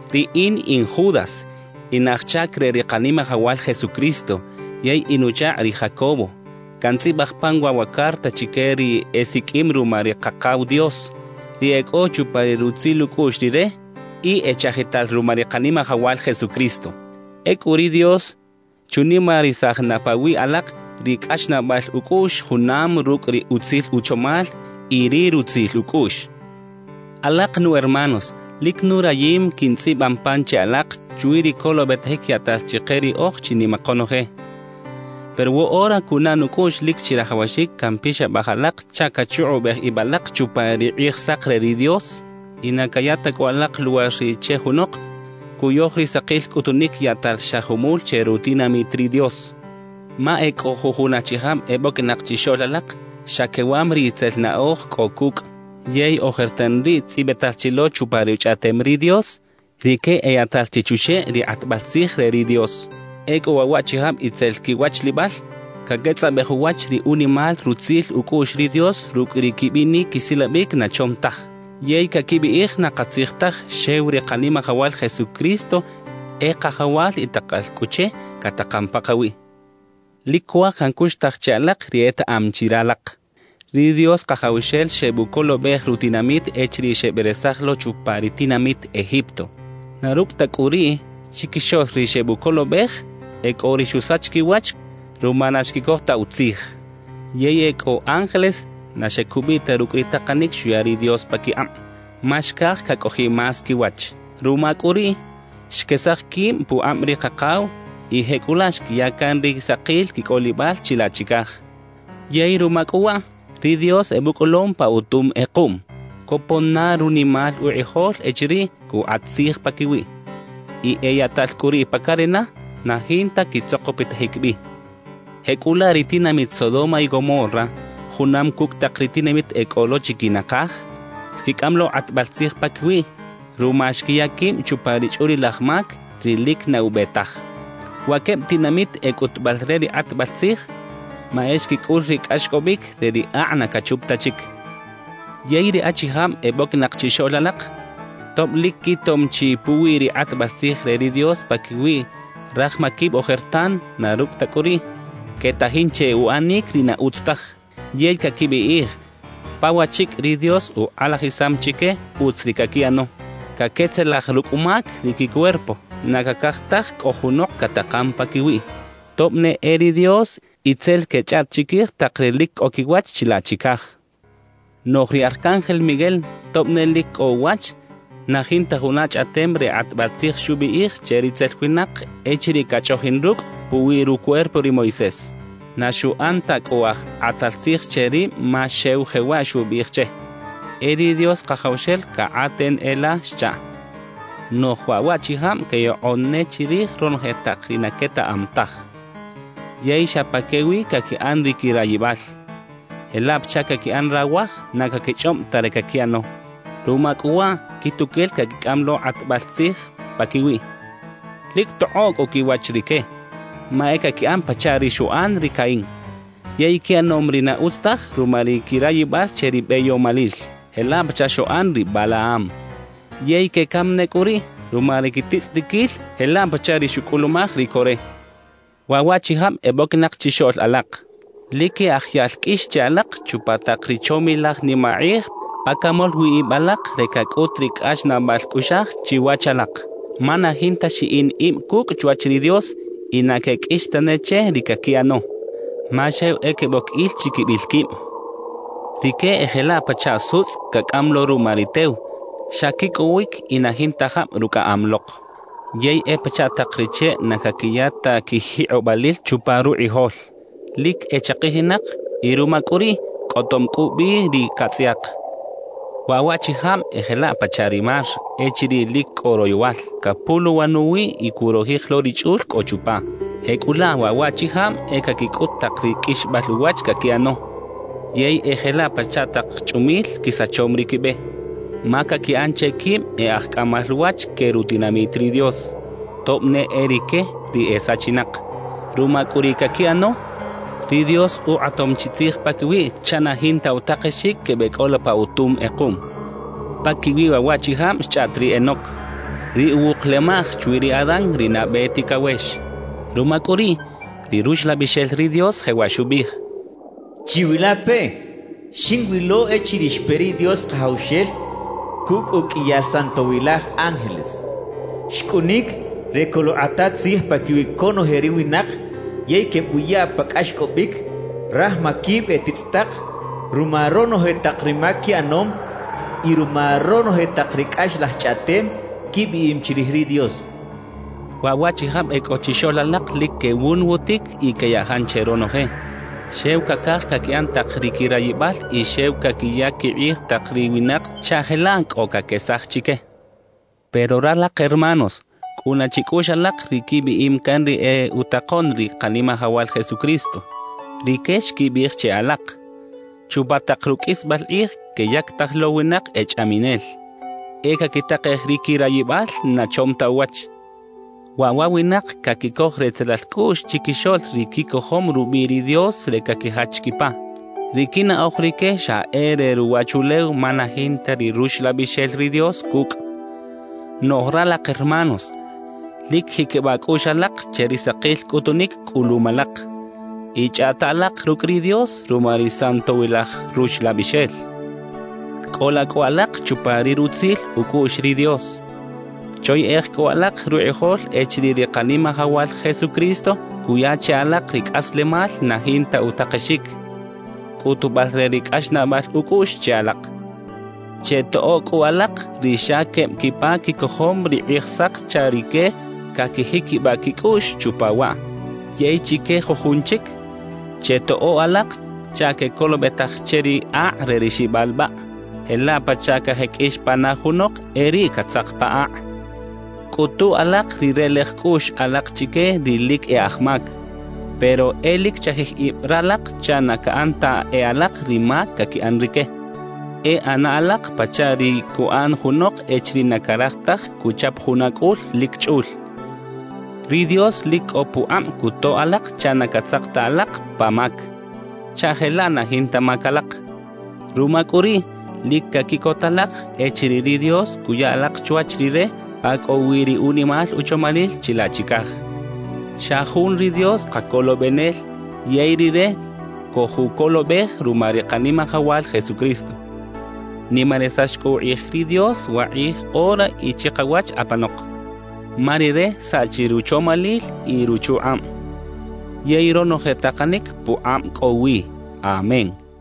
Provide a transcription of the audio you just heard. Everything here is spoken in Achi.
Riꞌin in Judas, in aj chac re ri Kanimajawal Jesucristo yey in uchakꞌ ri Jacobo. Cantzꞌibaj pan waꞌ wa carta chique ri esiqꞌuim ruma ri Kakaw Dios, ri e cꞌo chupa ri rutzil ucꞌuꞌx Rire y echajital ruma ri Kanimajawal Jesucristo. Ecꞌu ri Dios chunimarisaj na pawiꞌ alak ri cꞌaxnaꞌbal ucꞌuꞌx junam rucꞌ ri utzil uchomal y ri rutzil ucꞌuꞌx. Alak nu hermanos, lic nurayim quintzꞌiban pan che alak chwi ri colobetajic yaꞌtal chike riꞌoj chinima konoje; pero woꞌora cunaꞌ nucꞌuꞌx lic chirajawaxic campixabaj alak chaꞌ cachukꞌubej ib alak chupa ri Kꞌijsak re ri Dios y na caya ta cꞌu alak luwar riꞌ che junok cuyoj ri sakil cꞌutunic yaꞌtal xa jumul che rutinamit ri Dios. Ma e cꞌo jujun achijab eboquinak chixoꞌl alak, xa quewam ri itzel naꞌoj cꞌo cucꞌ. Yey ojertan riꞌ tzꞌibital chi lo chupa Ruchꞌaꞌtem ri Dios, rique eyaꞌtal chi chuxeꞌ ri kꞌatbal tzij re ri Dios. Ecꞌu waꞌ waꞌchijab itzel quiwachlibal, caquetzꞌabej uwach ri unimal rutzil ucꞌuꞌx ri Dios rucꞌ ri quibinic quisilabic na chom taj. Yey caquibiꞌij na katzij taj xew ri Kanimajawal Jesucristo e Kajawal y takal cꞌu che catakan pakawiꞌ. Lic cuaj cancuxtaj che alak ri etaꞌam chi ralak: Ri Dios Kajawxel xebucolobej rutinamit echiriꞌ xeberesaj lo chupa ri tinamit Egipto; na rucꞌ ta cꞌu riꞌ, chiquixoꞌl ri xebucolobej e cꞌo ri xusach quiwach ruma na xquicoj ta utzij. Yey e cꞌo ángeles na xecubiꞌ ta rucꞌ ri takanic xuya ri Dios paquikꞌab, ma xcaj cacꞌojiꞌ más quiwach. Ruma cꞌu riꞌ, xquesaj quib pukꞌab ri Kakaw y jecꞌulaꞌ xquiya can ri sakil quicꞌolibal chilaꞌ chicaj. Yey ruma cꞌu waꞌ, ri Dios ebucꞌolom pa utum kꞌekuꞌm, copon na runimal ukꞌijol echiriꞌ cukꞌat tzij paquiwiꞌ; y eyaꞌtal cꞌu riꞌ pa carena, na jinta quitzokpitajic bi. Jecꞌulaꞌ ri tinamit Sodoma y Gomorra junam cucꞌ tak ri tinamit e cꞌo lo chiquinakaj, xquicꞌam lo kꞌatbal tzij paquiwiꞌ ruma xquiya quib chupa ri chꞌulilaj mac, ri lic na ube taj. Wa queb tinamit e cꞌutubal re ri kꞌatbal tzij, ma e xquicꞌul ri cꞌaxcꞌobic re ri akꞌ na cachup ta chic. Yey ri achijab eboquinak chixoꞌl alak, tob lic quitom chi puwi ri kꞌatbal tzij re ri Dios paquiwi raj maquib ojertan, na rucꞌ ta cꞌu riꞌ, quetajin che uꞌanic ri na utz taj yey caquibiꞌij, pa wachicꞌ ri Dios ukꞌalajisam chique utz ri caquiꞌano. Caquetzelaj rucꞌ mac ri quicuerpo, na cacaj taj cꞌo junok catakan paquiwiꞌ tob ne e ri Dios y tzel quechꞌaꞌt chiquij tak ri lic cꞌo quiwach chilaꞌ chicaj. Noꞌj ri Arcángel Miguel, tob ne lic cꞌo uwach, na jinta juna chꞌaꞌtem re kꞌatbal tzij xubiꞌij che ritzel winak echiriꞌ cachꞌoꞌjin rucꞌ puwi rucuerpo ri Moisés. Na xuꞌan ta cꞌu aj kꞌatal tzij che rib ma xew jewaꞌ xubiꞌij che: «E ri Dios Kajawxel cakꞌaten e la» xchaꞌ Noꞌj waꞌ waꞌchijab queyokꞌon ne chirij ronoje tak ri na quetaꞌam taj; yey xa pa que wi caquiꞌan ri quirayibal jelaꞌ pachaꞌ caquiꞌan rawaj na caquichꞌob ta ri caquiꞌano. Ruma cꞌu waꞌ, quituquel caquicꞌam lo kꞌatbal tzij paquiwiꞌ. ¡Lic tokꞌoꞌ cꞌu quiwach rique! Ma e caquiꞌan pachaꞌ ri xuꞌan ri Caín. Yey quiꞌanom ri na utz taj ruma ri quirayibal che ri beyomalil, jelaꞌ pachaꞌ xuꞌan ri Balaam. Yey quecam ne cꞌu riꞌ ruma ri quititzꞌitiquil jelaꞌ pachaꞌ ri xucꞌulumaj ri Coré. Waꞌ waꞌchijab eboquinak chixoꞌl alak lic e aj yaꞌl qꞌuix che alak chupa tak ri chomilaj nimakꞌij pa camol wi ib alak re cacꞌut ri cꞌaxnaꞌbal cꞌuꞌxaj chiwach alak. Ma na jinta xiꞌin ib cucꞌ chwach ri Dios y na queqꞌuix tane che ri caquiꞌano, ma xew e queboc il chiquibil quib. Rique e jelaꞌ pachaꞌ sutzꞌ cacꞌam lo ruma ri tew; xa quicꞌowic y na jinta jab rucꞌaꞌam lok. Yey e pachaꞌ tak ri cheꞌ na caquiya ta quijikꞌobalil chupa rukꞌijol; lic echakijinak y ruma cꞌu riꞌ cꞌotom cꞌu bi ri catzꞌayak. Waꞌ waꞌchijab e jelaꞌ pachaꞌ ri mar echiriꞌ lic cꞌo royowal, capuluwan uwiꞌ y curojij lo ri chꞌul cꞌo chupa. Jecꞌulaꞌ, waꞌ waꞌchijab e caquicꞌut tak ri qꞌuixbal uwach caquiꞌano. Yey e jelaꞌ pachaꞌ tak chꞌumil quisachom ri quibe, ma caquiꞌan che quib e aj cꞌamal wach que rutinamit ri Dios, tob ne e rique ri e sachinak. Ruma cꞌu ri caquiꞌano, ri Dios ukꞌatom chi tzij paquiwiꞌ chaꞌ na jinta utakexic quebeꞌcꞌola pa utum kꞌekuꞌm. Paquiwi waꞌ waꞌchijab xchꞌaꞌt ri Enoc, ri uwuk lemaꞌj chwi ri Adán ri nabe ticawex. Ruma cꞌu riꞌ, ri Ruxlabixel ri Dios jewaꞌ xubiꞌij: «¡Chiwilapeꞌ! Xinwilo echiriꞌ xpe ri Dios Kajawxel cucꞌ uqꞌuiyal santowilaj ángeles. Xcꞌunic re coluꞌkꞌata tzij paquiwi conoje ri winak yey quebuya pa cꞌaxcꞌobic raj maquib e titzꞌitak ruma ronoje tak ri mac quiꞌanom y ruma ronoje tak ri cꞌaxlaj chꞌaꞌtem quibiꞌim chirij ri Dios.» Waꞌ waꞌchijab e cꞌo chixoꞌl alak lic quewunwutic y queyajan che ronoje. Xew cacaj caquiꞌan tak ri quirayibal y xew caquiyac quikꞌij tak ri winak chaꞌ jelaꞌ cꞌo caquesaj chique. Pero ralak hermanos, cꞌuna chicꞌuꞌx alak ri quibiꞌim can ri e utakoꞌn ri Kanimajawal Jesucristo. Rique xquibiꞌij che alak: «Chupa tak ruqꞌuisbal kꞌij queyactaj lo winak e chꞌaminel, e caquitakej ri quirayibal na chom ta uwach.» Waꞌ wa winak caquicoj retzelal cꞌuꞌx chiquixoꞌl ri quicojom rubiꞌ ri Dios re caquijach quipa. Ri quinaꞌoj rique xa e re ruwachulew ma na jinta ri Ruxlabixel ri Dios cucꞌ. Noꞌj ralak hermanos, lic jiquibaꞌ cꞌuꞌx alak che ri sakil cꞌutunic cꞌulum alak y chꞌaꞌta alak rucꞌ ri Dios ruma ri Santowilaj Ruxlabixel. Cꞌola cꞌu alak chupa ri rutzil ucꞌuꞌx ri Dios. Choyeꞌej cꞌu alak rukꞌijol echiriꞌ ri Kanimajawal Jesucristo cuya che alak ri cꞌaslemal na jinta utakexic, cꞌutubal re ri cꞌaxnaꞌbal ucꞌuꞌx che alak. Chetoꞌo cꞌu alak ri xa queb quipa quicojom ri Kꞌijsak chaꞌ rique caquijiquibaꞌ quicꞌuꞌx chupa waꞌ. Yey chique jujun chic, chetoꞌo alak chaꞌ quecolobetaj che ri akꞌ re ri xibalbaꞌ, jelaꞌ pachaꞌ cajeqꞌuix pana junok e riꞌ catzak pa akꞌ. Cꞌutu alak ri relej cꞌuꞌx alak chique ri lic e aj mac. Pero e lic chajij ib ralak chaꞌ na caꞌan ta e alak ri mac caquiꞌan rique; e ꞌana alak pachaꞌ ri cuꞌan junok echiriꞌ na caraj taj cuchap juna cꞌul lic chꞌul. Ri Dios lic cꞌo pukꞌab cutoꞌ alak chaꞌ na catzak ta alak pa mac, chaꞌ jelaꞌ na jinta mac alak. Ruma cꞌu riꞌ, lic caquiꞌcot alak echiriꞌ ri Dios cuya alak chwach Rire pa cꞌo wi ri unimal uchomalil chilaꞌ chicaj. Xa jun ri Dios Kacolobenel yey Rire cojucolobej ruma ri Kanimajawal Jesucristo. Nimarisax cꞌu ukꞌij ri Dios wakꞌij ora y chikawach apanok, ma Rire saꞌchi ruchomalil y ruchukꞌab, yey ronoje takanic pukꞌab cꞌo wi. Amén.